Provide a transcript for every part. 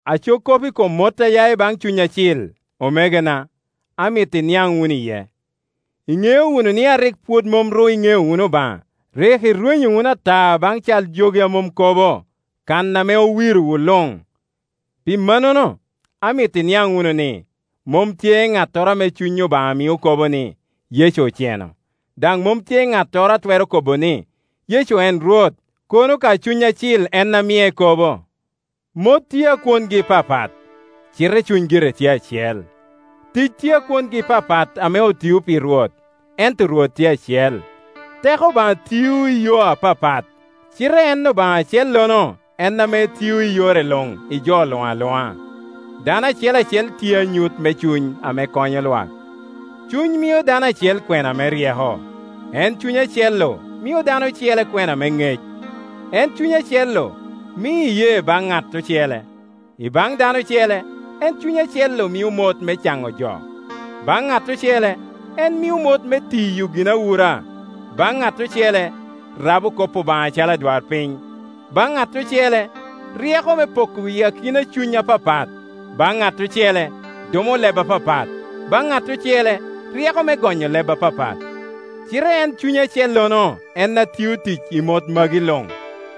Aco kop i kom mot a ya i baŋ Cuny Acil, omegona, amito iniaŋ wunu iye. Iŋeo wunu ni a rik pwod mom ru iŋeo wunu Obaŋa, rik irwenyo wunu ata baŋ cal jogi a mom kobo, kan ame owirowu luŋ. Pi mannono, amito iniaŋ wunu ni, mom tye ŋattoro ame Cuny Obaŋa mio kobo ni, “Yecu oceno”; daŋ mom tye ŋattoro a twero kobo ni, “Yecu en Rwot,” kono ka Cuny Acil en a mie kobo. Mot tye a kwongi papat, cite Cuny gire tye acel. Tic tye a kwongi papat ame otio pi Rwot, ento Rwot tye acel. Teko Obaŋa tio i yo apapat, cite en Obaŋa acellono en ame tio i yore luŋ i jo luŋ aluŋa. Dano acel acel tye anyut me cuny ame konyo lwak. Cuny mio dano acel kwena me ryeko; en Cuny acel-lu mio dano ocele kwena me ŋec. En Cuny acel-lu mio iyee baŋ ŋat ocele, i baŋ dano ocele en Cuny acel-lu mio mot me caŋo jo; baŋ ŋat ocele en mio mot me tiyo ginawura, baŋ ŋat ocele rabo kop Obaŋa acalo adwarpiny, baŋ ŋat ocele ryeko me poko i kin cuny apapat, baŋ ŋat ocele dumo leb apapat, baŋ ŋat ocele ryeko me gonyo leb apapat. Cite en Cuny acellono en a tio tic i mot magi luŋ;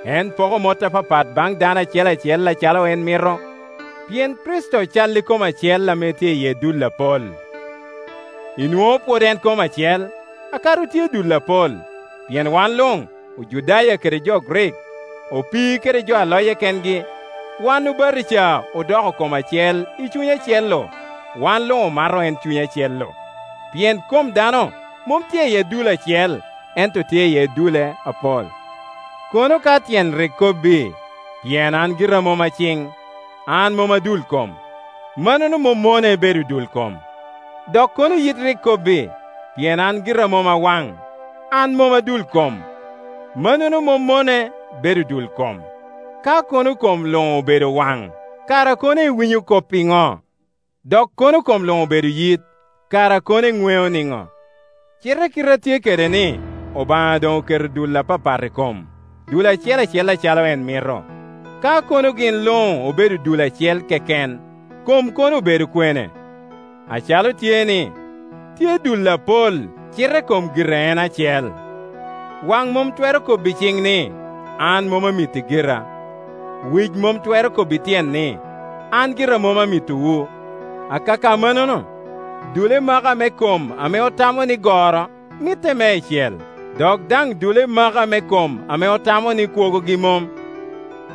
en poko mot apapat baŋ dano acel acel acalo en mito. Pien Kricito cal i kom acel ame tye iye dul apol; inwoŋo pwod en kom acel, kadi otye dul apol. Pien wan luŋ, Ojudaya kede jo Grik, opii kede jo a loye kengi, wan obatija odoko kom acel i Cuny acel-lu, wan luŋ omato en Cuny acel-lu. Pien kom dano mom tye iye dul acel, ento tye iye dul apol. Kono ka tyen rik kobbi, “Pien an gira mom a ciŋ, an mom a dul kom,” mannono mom mone bedo dul kom. Dok kono yit rik kobbi, “Pien an gira mom a waŋ, an mom a dul kom,” mannono mom mone bedo dul kom. Ka kono kom luŋ obedo waŋ, kara kono cwinyo kop iŋo? Dok kono kom luŋ obedo yit, kara kono eŋweo niŋo? Cite kite a tye kede ni, Obaŋa doŋ oketo dul apapat i kom, dul acel acel acalo en mito. Ka kono gin luŋ obedo dul acel keken, kom kono obedo kwene? Acalo tye-ni, tye dul apol, cite kom gire en acel. Waŋ mom twero kobbi ciŋ ni, “An mom amiti gira.” Wic mom twero kobbi tyen ni, “An gira mom amitowu.” Akaka mannono, dule maka me kom ame otamo ni goro mitte meicel, dok daŋ dule maka me kom ame otamo ni kwogogi mom,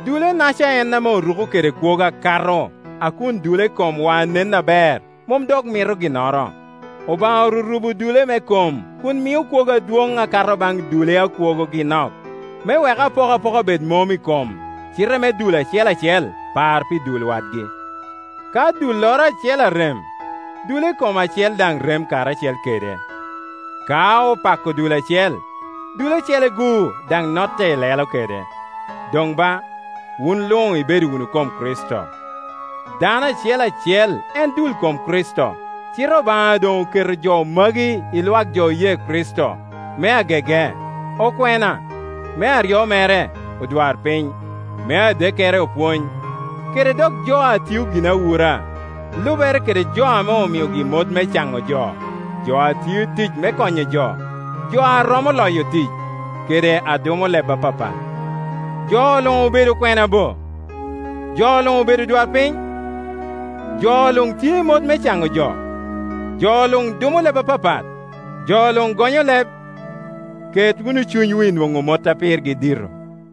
dule-naca en ame oruko kede kwogo akato, a kun dule komwa a nen aber mom dok mito ginnoro. Obaŋa orurubo dule me kom kun mio kwogo adwoŋ akato baŋ dule a kwogogi nok, me wek apokapoka bed mom i kom, cite me dul acel acel par pi dul wadgi. Ka dulloro acel arem, dule kom acele daŋ rem karacel kede; ka opako dul acel, dule ocele-gu daŋ notte ilelo kede. Doŋ ba, wun luŋ ibedo wunu kom Kricito, dano acel acel en dul kom Kricito. Cite Obaŋa doŋ oketo jo magi i lwak jo oye Kricito: me agege okwena, me aryo mere odwarpiny, me adekkere opwony, kede dok jo a tio ginawura, lubere kede jo ame omiogi mot me caŋo jo, jo a tio tic me konyo jo, jo a romo loyo tic, kede a dumo leb apapat. Jo luŋ obedo okwena bo? Jo luŋ obedo odwarpiny? Jo luŋ tye i mot me caŋo jo? Jo luŋ dumo leb apapat? Jo luŋ gonyo leb? Ket wunu cunywu i nwoŋo mot a pirgi dito.